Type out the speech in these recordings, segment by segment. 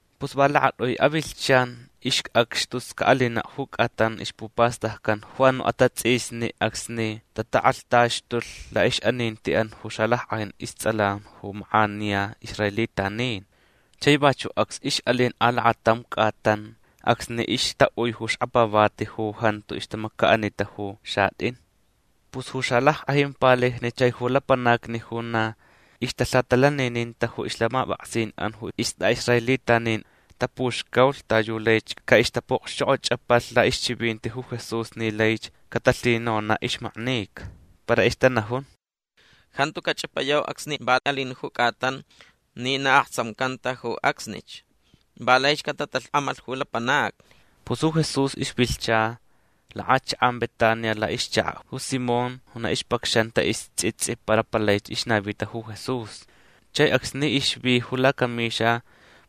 Pus va lakat'ui avilhchan ixc'acx tus ca'alina' ju c'atan ixpupastaccan ju anu' atats'isni acsni tatak'alhtaxtulh la'ix'aninti'an ju xalack'ajin ists'alan ju mak'aniya israelitanin. Chai vachu' acs ix'alin alakatam c'atan acsni ixta'ui ju xkapavati ju jantu ixtamaca'anita ju xat'in. Pus ju xalack'ajin palijni chai ju lapanacni ju na ixtalhatalanininta ju ixlhamap'aksin'an ju ist'a'israelitanin tapuxcaulh ta yu laich ca'ixtapu'okxchok'och'apalh la'ixchivinti ju Jesús ni laich catalhinona' ixmaknica. Para ixtanajun: ―Jantu cach'apayau acsni va alin ju c'atan ni na aktsamcanta ju acsnich. Va laich catatalhk'amalh ju lapanacni. Pus ju Jesús ixvilhcha lak'achak'an Betania la'ixchaka' ju Simón ju na ixpacxanta ists'its'i para palaich ixnavita ju Jesús. Chai acsni ixvi ju lacamixa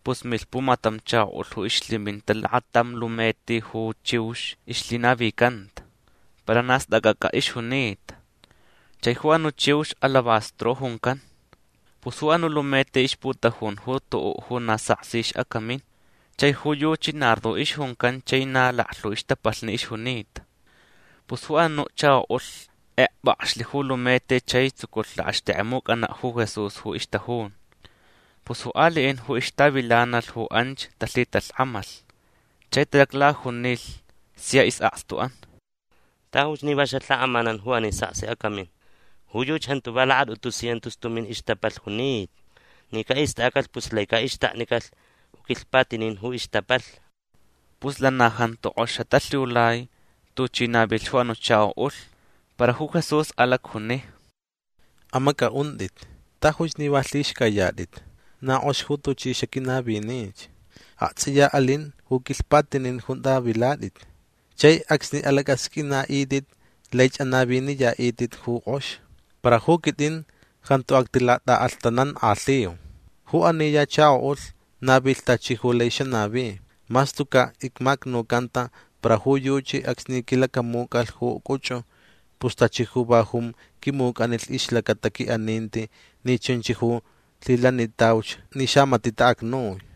pus milh pumatam chako'ulh ju ixlhiminta lakatam lumeti ju chiux ixlhinavicanta. Para na stac'ac'a ixjunita. Chai ju anu' chiux alabastro juncan. Pus ju anu' lumeti ixputajun ju tu'u' ju na saksi ix'acamin. Chai ju yuchi nardo ixjuncan chai na laklhu ixtapalh ixjunita. Pus ju anu' chako'ulh kekp'akxlh ju lumeti chai tsuculh lakxtixt'ek'emuc'ana' ju Jesús ju ixtajun. Pus ju ali'in ju ixtavilanalh ju anch talhitalhk'amalh. Chai talaclajunilh sia is'akstu'an: ―Tajuch ni va xalhak'amanan ju ani saksi acamin. Ju yuchi jantu va lakat'utu cientos tumin ixtapalh junita. Ni ca'ist'acalh pus lai ca'ixtaknicalh ju quilhpatinin ju ixtapalh. Pus lana jantu k'ox xatalhiulai tuchi navilh ju anu' chako'ulh. Para ju Jesús alacjuni: ―Amac'a'unt'it. Tajuch ni va lhixc'ayat'it. Na k'ox ju tuchi xaquinavinich. Akts'iya alin ju quilhpatinin junta vilat'it. Chai acsni alac'asq'uina'it'it laich anaviniya'it'it ju k'ox. Para ju quit'in jantu actilat'a'alhtanank'alhiu. Ju ani ya chako'ulh navilh tachi ju lai xanavi. Mas tuca' icmacnucanta para ju yuchi acsni quilacamuc'alh ju c'uch'u pus tachi ju va jun quimuc'alh ixlacata qui'aninti ni chunch ju lhilanicantauch ni xamati' ta'acnui.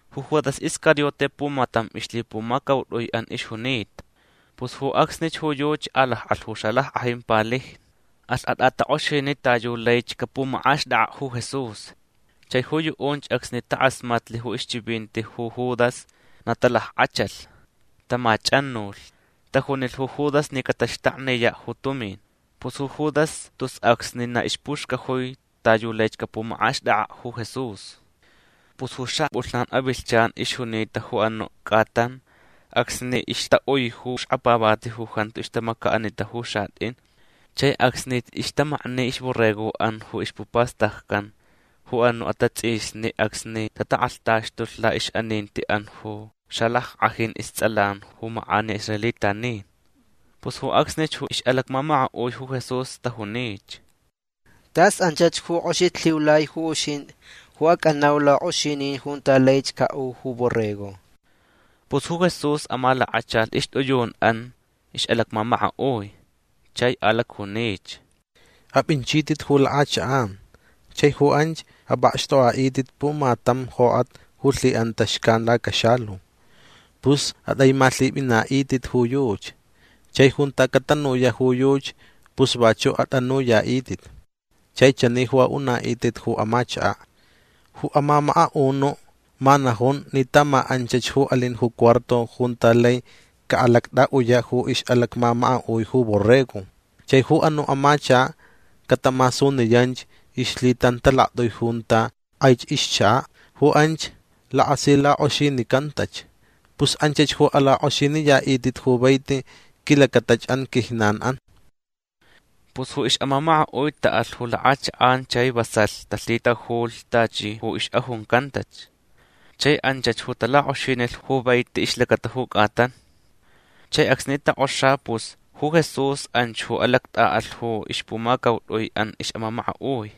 Ju Judas Iscariote pumatam ixlhipumacaut'ui'an ixjunita. Pus ju acsnich ju yuchi alak'alh ju xalack'ajin palijni. Alh at'atak'oxini' ta yu laich capumak'axt'ak'a' ju Jesús. Chai ju yu'unch acsni tak'asmatlh ju ixchivinti ju Judas na talack'achalh. Tamach'anulh. Tajunilh ju Judas ni cataxtakniya' ju tumin. Pus ju Judas tus acsnich na ixpuxcajui ta yu laich capumak'axt'ak'a' ju Jesús. Pus ju xap'ulhnan avilhchan ixjunita ju anu' c'atan acsni ixta'ui ju xkapavati ju jantu ixtamaca'anita ju xat'in chai acsni ixtamakni ixborrego'an ju ixpupastaccan ju anu' atats'isni acsni tatak'alhtaxtulh la'ix'aninti'an ju xalack'ajin ists'alan ju mak'aniya israelitanin. Pus ju acsnich ju ix'alacmamaka'ui ju Jesús tajunich: ―Tas anchach ju k'oxich lhiulai ju uxint'i ju ac'anau lak'oxinin junta laich ca'u ju borrego. Pus ju Jesús amalakachalh ixt'iyun'an ix'alacmamaka'ui. Chai alacjunich: ―Ap'inchit'it ju lak'achak'an. Chai ju anch ap'akxt'ok'a'it'it pumatam jok'at ju lhi'anta xcan lacaxalu. Pus at'aimalhip'ina'it'it ju yuchi. Chai junta catanuya' ju yuchi pus vachu' at'anuya'it'it. Chai chani ju a'una'it'it ju amachaka': “Ju amamaka'unu' ma najun ni ta ma anchach ju alin ju cuarto junta lai cat'a'uya' ju borrego ju ix'alacmamaka'ui”. Chai ju anu' amachaka' catamasuniyanch ixlhitantalakt'ui junta k'aich ixchaka'. Ju anch lakasilak'oxinincantach. Pus anchach ju alak'oxiniya'it'it ju vaiti quilacatach'an quijnan'an. Pus ju ix'amamaka'ui ta'alh ju lak'achak'an chai vasalh talhitajulh tachi ju ix'ajuncantach. Chai anchach ju talak'oxinilh ju vaiti ixlacata ju c'atan. Chai acsni tok'oxa pus ju Jesús anch ju alact'a'alh ju ixpumacaut'ui'an ix'amamaka'ui.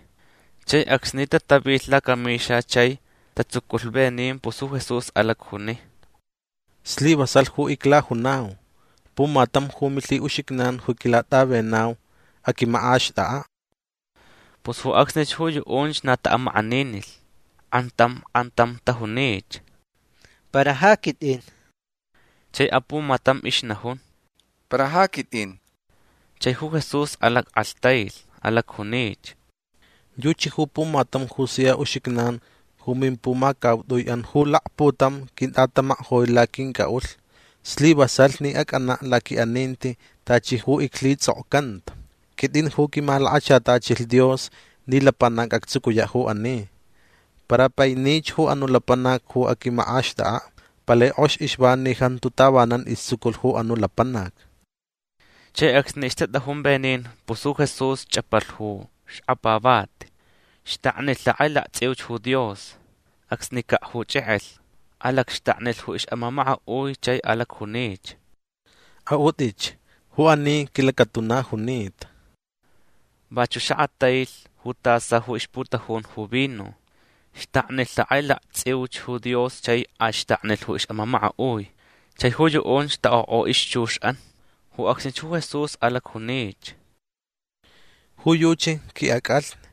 Chai acsni tatavilh lacamixa chai tatsuculh venin pus ju Jesús alacjuni: ―Slivasalh ju iclajunau. Pumatam ju milhi'uxijnan ju quilat'avenau aquimak'axt'ak'a'. Pus ju acsnich ju yu'unch na ta'amak'aninilh. K'antam k'antam tajunich: ―Para ja quit'in. Chai apumatam ixnajun: ―Para ja quit'in. Chai ju Jesús alack'alhtailh. Alacjunich: ―Yuchi ju pumatam ju sia uxijnan ju mimpumacaut'ui'an ju lakputam quint'atamajk'oi laquinc'a'ulh. Slivasalh ni ac'ana' laqui'aninti tachi ju iclhits'okcanta. Quit'in ju quimalakachatachilh Dios ni lapanac actsucuya' ju ani. Para painich ju anu' lapanac ju aquimak'axt'ak'a'. Palai k'ox ixva ni jantu tavanan istsuculh ju anu' lapanac. Chai acsni ixtat'ajun venin pus ju Jesús ch'apalh ju xkapavati. Xtaknilh lhak'ailakts'iuch ju Dios. Acsnica' ju ch'ek'elh. Alacxtaknilh ju ix'amamaka'ui chai alacjunich: ―A'ut'itch. Ju ani quilacatuna junita. Vachu' xakatailh ju tasa ju ixputajun ju vino. Xtaknilh lhak'ailakts'iuch ju Dios chai axtaknilh ju ix'amamaka'ui. Chai ju yu'unch tak'otk'o ixchux'an. Ju acsnich ju Jesús alacjunich: ―Ju yuchi qui'ac'alhni.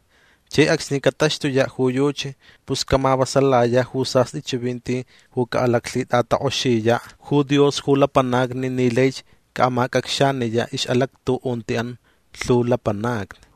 Chai acsni cataxtuya' ju yuchi pus camavasalaya' ju sast'i chivinti ju ca'alaclhit'atak'oxiya' ju Dios ju lapanacni ni laich ca'amac'acxaniya' ix'alactu'unti'an lhu lapanacni.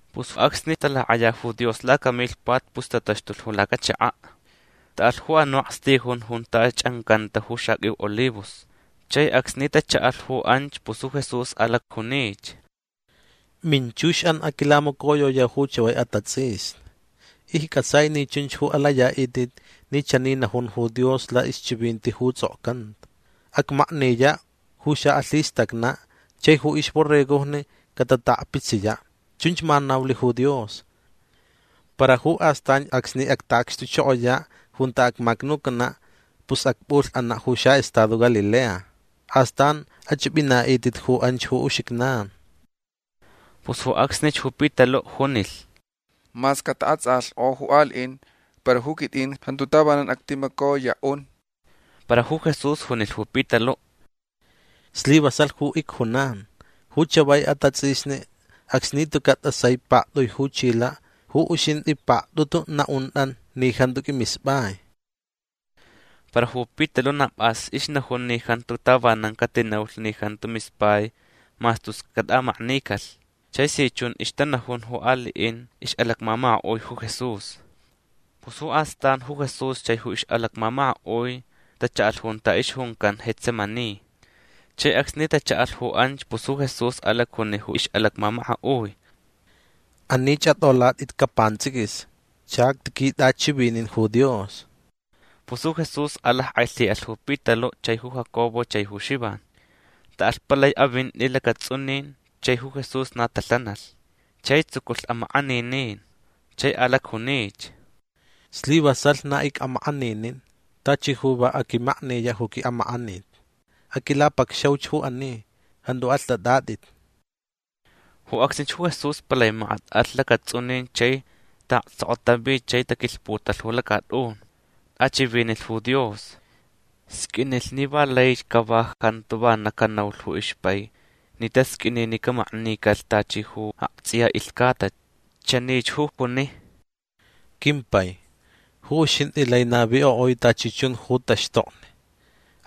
Pus acsni talak'aya ju Dios lacamilhpat pus tataxtulh ju lacachaka'. Ta'alh ju anu' akstijun junta ch'ancanta ju xaq'uiu olivos. Chai acsni tacha'alh ju anch pus ju Jesús alacjunich: ―Minchux'an aquilamacoyok'oyau ju chavai atats'isni. Icc'atsai ni chunch ju alaya'it'it ni chani najun ju Dios la'ixchivinti ju ts'okcanta: “Acmakniya' ju xa'alhistacna'. Chai ju ixborregojni catata'akpitsiya'”. Chunch ma naulh ju Dios. Para ju astanch acsni acta'acxtuchokoya' junta acmacnucana' pus acp'ulh'ana' ju xa'estado Galilea. Astan ach'ip'ina'it'it ju anch ju uxijnan. Pus ju acsnich ju Pitalu' junilh: ―Mas cata'ats'alhk'o ju ali'in para ju quit'in jantu tavanan actimacoya'un. Para ju Jesús junilh ju Pitalu': ―Slivasalh ju icjunan. Ju chavai atats'isni acsni tuca' t'asai pakt'ui ju chila' ju uxint'i pakt'utu na'unt'a ni jantu q'uimisp'ai. Para ju Pitalu' na p'as ixnajun ni jantu tavanan catinaulh ni jantu mispai mas tus cat'amaknicalh. Chai si chun ixtanajun ju ali'in ix'alacmamaka'ui ju Jesús. Pus ju astan ju Jesús chai ju ix'alacmamaka'ui tacha'alh junta ixjuncan Getsemaní. Chai acsni tacha'alh ju anch pus ju Jesús alacjuni ju ix'alacmamaka'ui: ―Anich at'olat'itca' pants'iquis. Chactiquit'achivini' ju Dios. Pus ju Jesús alack'ailhi'alh ju Pitalu' chai ju Jacobo chai ju Xivan. Ta'alh palai avinti lacats'unin chai ju Jesús na talhanalh. Chai tsuculh amak'aninin. Chai alacjunich: ―Slivasalh na ic'amak'aninin. Tachi ju va aquimakniya' ju qui'amak'anit. Aquilapacxauch ju ani. Jantu alht'at'at'it. Ju acsnich ju Jesús palai makat alh lacats'unin chai ta'aktsokotavi chai taquilhputalh ju lacat'un. T'achivinilh ju Dios. Sq'uinilh ni va laich cava jantu vana canaulh ju ixpai ni tasq'uini ni camaknicalh tachi ju akts'iya ilhcata. Chanich ju juni: ―Quimpai ju uxint'i lai navik'o'ui tachi chun ju taxtokni.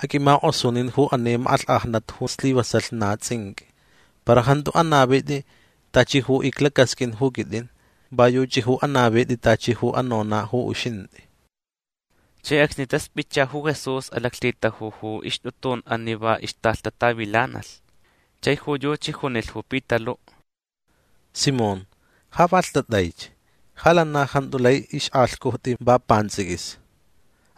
Aq'uimak'osunin ju ani mak'alhk'ajnat ju slivasalh na ts'inq'ui. Para jantu anavit'i tachi ju iclacasq'uin ju quit'in. Va yuchi ju anavit'i tachi ju anona' ju uxint'i. Chai acsni tasp'itcha ju Jesús alaclhitajulh ju ixt'utun'an ni va ixtalhtatavilanalh. Chai ju yuchi junilh ju Pitalu': ―Simón ja va lht'at'aich. Ja lana jantu lai ixk'alhc'ujt'i va pants'iquis.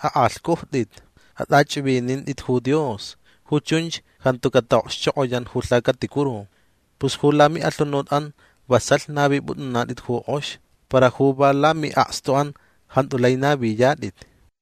Ak'alhc'ujt'it. At'ach'ivinint'it ju Dios. Ju chunch jantu cata'okxchok'oyan ju lhacaticuru. Pus ju lami'alhunut'an vasalh navip'ut'unat'it ju k'ox. Para ju va lami'akstu'an jantu lai naviyat'it.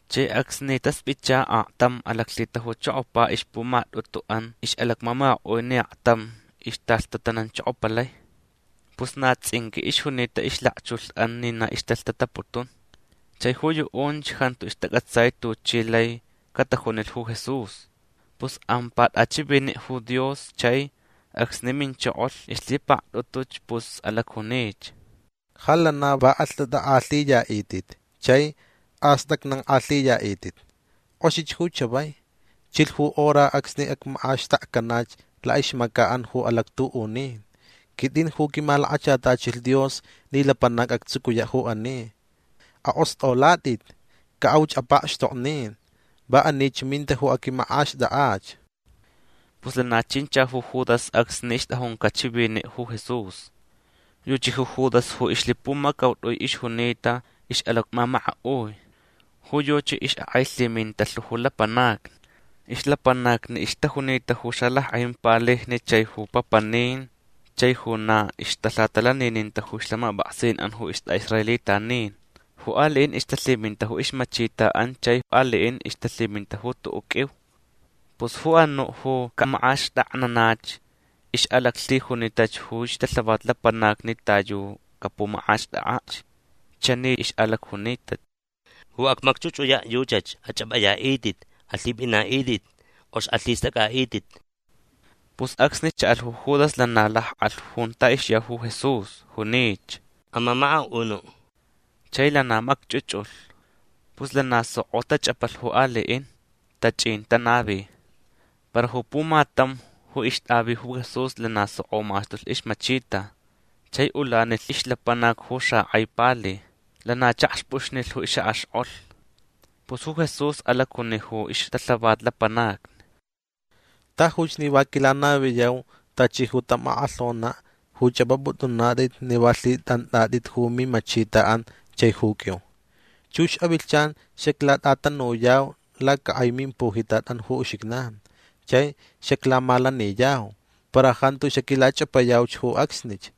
Chai acsni tasp'itcha aktam alaclhitajuchokopa ixpumat'utu'an ix'alacmamaka'ui ni aktam ixtalhtatananchokopalai. Pus na ts'inq'ui ixjunita ixlakchulh'an ni na ixtalaclhtataputun. Chai ju yu'unch jantu ixtac'atsai tuchi lai catajunilh ju Jesús. Pus ampa t'achivini' ju Dios chai acsni minchokolh ixlhipakt'utuch pus alacjunich: ―Ja lana va alht'at'ak'alhiya'it'it chai ast'acnank'alhiya'it'it. K'oxich ju chavai. Chilh ju hora acsni acmak'axtakcanach la'ixmaca'an ju alactu'unin. Quit'in ju quimalakachatachilh Dios ni lapanac actsucuya' ju ani. Ak'ost'olat'it. Ca'auch apakxtoknin. Va anich minta ju aquimak'axt'ak'ach. Pus lana chincha ju Judas acsni ixt'ajunca' chivini' ju Jesús. Yuchi ju Judas ju ixlhipumacaut'ui ixjunita ix'alacmamaka'ui. Ju yuchi ix'ak'ailhiminta lhu ju lapanacni. Ixlapanacnich ixtajunita ju xalack'ajin palijni chai ju papanin chai ju na ixtalhatalanininta ju ixlhamap'aksin'an ju ist'a'israelitanin. Ju ali'in ixtalhiminta ju ixmachita'an chai ali'in ixtalhiminta ju tu'u' q'uiu. Pus ju anu' ju camak'axtaknanach ix'alaclhijunitach ju ixtalhavat lapanacni ta yu capumak'axt'ak'ach. Chani ix'alacjunita: ―Ju acmacch'uch'uya' yuchach. Ach'ap'aya'it'it. Alhip'ina'it'it. K'ox alhist'ac'a'it'it. Pus acsni cha'alh ju Judas lana lak'alh junta ixya ju Jesús. Junich: ―Amamaka'unu'. Chai lana macch'uch'ulh. Pus lana soko tach'apalh ju ali'in. Tach'in tanavi. Para ju pumatam ju ixt'avi ju Jesús lana soko maxtulh ixmachita. Chai ulanilh ixlapanac ju xak'ai pali. Lana chakxp'uxnilh ju ix'ak'axk'olh. Pus ju Jesús alacjuni ju ixtalhavat lapanacni: ―Tajuch ni va quilanaviyau tachi ju tam ak'alhona' ju ch'ap'ap'ut'unat'it ni va lhit'ant'at'it ju mimachita'an chai ju q'uiu. Chux avilhchan xaclat'atanuyau lacak'ai mimpujitat'an ju uxijnan. Chai xaclamalaniyau. Para jantu xaquilach'apayauch ju acsnich.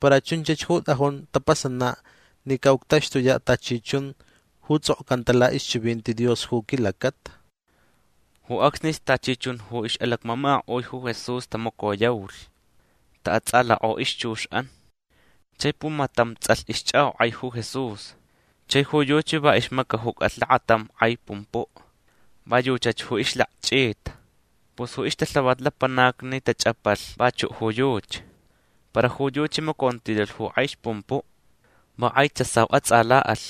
Para chunchach ju t'ajun tapasana' ni ca'uctaxtuya' tachi chun ju ts'okcanta la'ixchivinti Dios ju quilacata. Ju acsnich tachi chun ju ix'alacmamaka'ui ju Jesús tamacoyaulh. Ta'ats'alhk'o ixchux'an. Chai pumatam ts'alh ixch'ak'ok'ai ju Jesús. Chai ju yuchi va ixmacajucalh lakatam k'ai pumpu'. Va yuchach ju ixlakch'ita. Pus ju ixtalhavat lapanacni tach'apalh vachu' ju yuchi. Para ju yuchi macontilalh ju k'ai ixpumpu'. Va k'ai tsasau ats'ala'alh.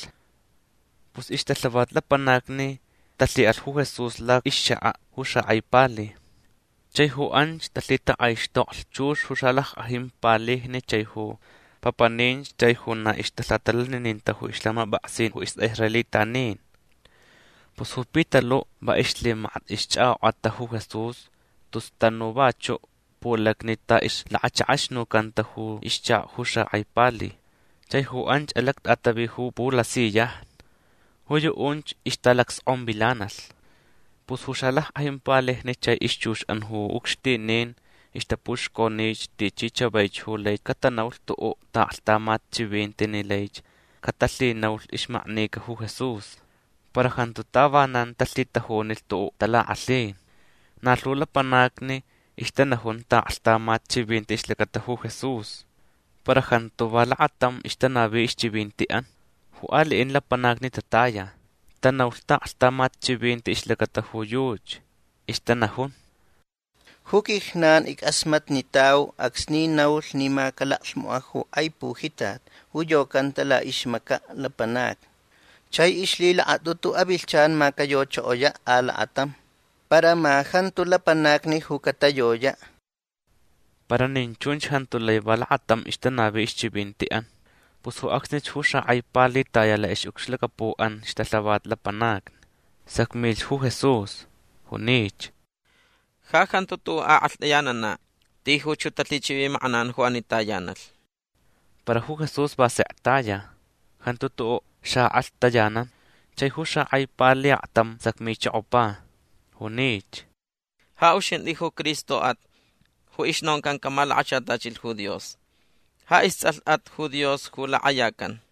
Pus ixtalhavat lapanacni talhi'alh ju Jesús la'ixchaka' ju xak'ai pali. Chai ju anch talhitak'aixtoklh chux ju xalack'ajin palijni chai ju papaninch chai ju na ixtalhatalanininta ju ixlhamap'aksin ju ist'a'israelitanin. Pus ju Pitalu' va ixlhimakat ixch'ak'ok'ata ju Jesús tus tanu vachu' pulacni ta ixlakachak'axnucanta ju ixchaka' ju xak'ai pali. Chai ju anch alact'atavi ju pulasiyajni. Ju yu'unch ixtalacsk'onvilanalh. Pus ju xalack'ajinch palijni chai ixchux'an ju ucxtinin ixtapuxconich tichi chavaich ju lai catanaulh tu'u' ta'aklhtamat chivinti ni laich catalhinaulh ixmaknica ju Jesús. Para jantu tavanan talhitajunilh tu'u' talak'alhin. Na lhu lapanacni ixtanajun ta'aklhtamat chivinti ixlacata ju Jesús. Para jantu va lakatam ixtanavi ixchivinti'an. Ju ali'in lapanacni tataya. Tanaulh ta'aklhtamat chivinti ixlacata ju yuchi. Ixtanajun: ―Ju quijnan ick'asmatnitau acsni naulh ni ma calaclhmoka' ju k'ai pujitat ju yocanta la'ixmaca' lapanacni. Chai ixlhilakat'utu avilhchan ma cayochokoya' alakatam. Para ma jantu lapanacni ju catayoya'. Para nin chunch jantu lai va lakatam ixtanavi ixchivinti'an. Pus ju acsnich ju xak'ai pali taya la'ix'ucxlacapu'an ixtalhavat lapanacni. Sacmilh ju Jesús. Junich: ―Ja jantu tu'u' ak'alht'ayanana'. Tijuch ju talhichivimak'anan ju ani tayanalh. Para ju Jesús va sek taya. Jantu tu'u' xa'ak'alhtayanan. Chai ju xak'ai pali aktam sacmichokopa. Junich: ―Ja uxint'i ju Cristo'at ju ixnoncan camalakachatachilh ju Dios. Ja ists'alh'at ju Dios ju lak'ayacan.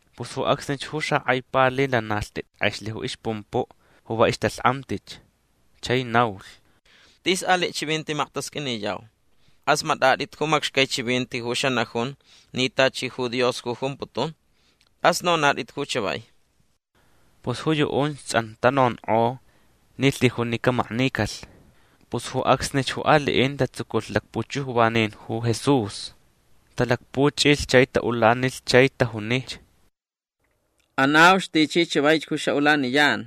Pus ju acsnich ju xak'ai pali lana lht'it k'exlh ju ixpumpu' ju va ixtalhk'amtich. Chai naulh: ―Tis ali' chivinti maktasq'uiniyau. K'asmat'at'it ju macxcai chivinti ju xanajun ni tachi ju Dios ju jumputun. Tas nonat'it ju chavai. Pus ju yu'unch ts'an tanonk'o ni lhijunch ni camaknicalh. Pus ju acsnich ju ali'in tatsuculh lakpuchujvanin ju Jesús. Talakpuch'ilh chai ta'ulanilh chai tajunich: ―Anauch tichi chavaich ju xa'ulaniyan.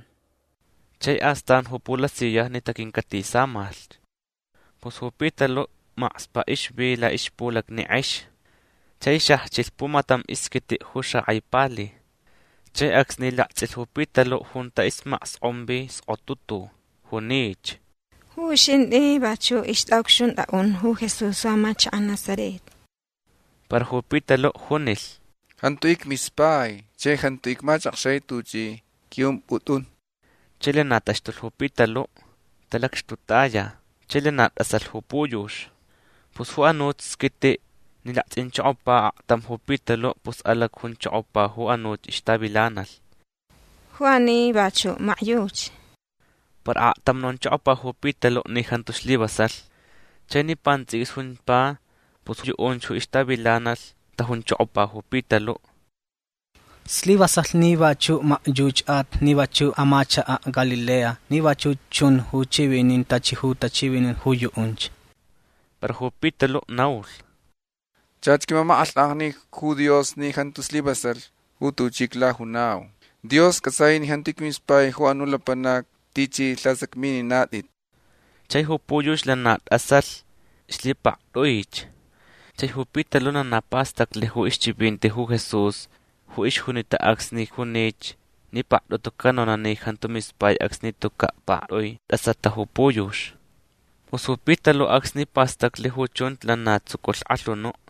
Chai astan ju pulasiyajni taquincatisamalh. Pus ju Pitalu' makspa' ixvi la'ixpulacni k'ex. Chai xajchilh pumatam isquiti' ju xak'ai pali. Chai acsni lakts'ilh ju Pitalu' junta ismaksk'onvi skotutu. Junich: ―Ju uxint'i vachu' ixt'a'ucxunt'a'un ju Jesús amachaka' Nazaret. Para ju Pitalu' junilh: ―Jantu icmispai chai jantu icmachakxai tuch'i q'ui'ump'ut'un. Chai lana taxtulh ju Pitalu'. Talacxtutaya. Chai lana t'asalh ju puyux. Pus ju anuch squiti' ni lakts'inchokopa aktam ju Pitalu' pus alacjunchokopa ju anuch ixtavilanalh: ―Ju ani vachu' makyuchi. Para aktam nonchokopa ju Pitalu' ni jantu slivasalh. Chai ni pants'iquis jumpa pus yu'unch ju ixtavilanalh tajunchokopa ju Pitalu': ―Slivasalh ni vachu' makyuch'at ni vachu' amachaka'at Galilea ni vachuch chun ju ch'ivinin tachi ju tachivinin ju yu'unch. Para ju Pitalu' naulh: ―Chach quimamak'alhk'ajni ju Dios ni jantu slivasalh ju tuchi iclajunau. Dios c'atsai ni jantu icmispai ju anu' lapanac tichi lhasacmininat'it. Chai ju puyux lana t'asalh ixlhipakt'uich. Chai ju Pitalu' lana pastaclh ju ixchivinti ju Jesús ju ixjunita acsni junich ni pakt'utu canona' ni jantu mispai acsni tuca' pakt'ui t'asata ju puyux. Pus ju Pitalu' acsni pastaclh ju chunch lana tsuculh k'alhunu'.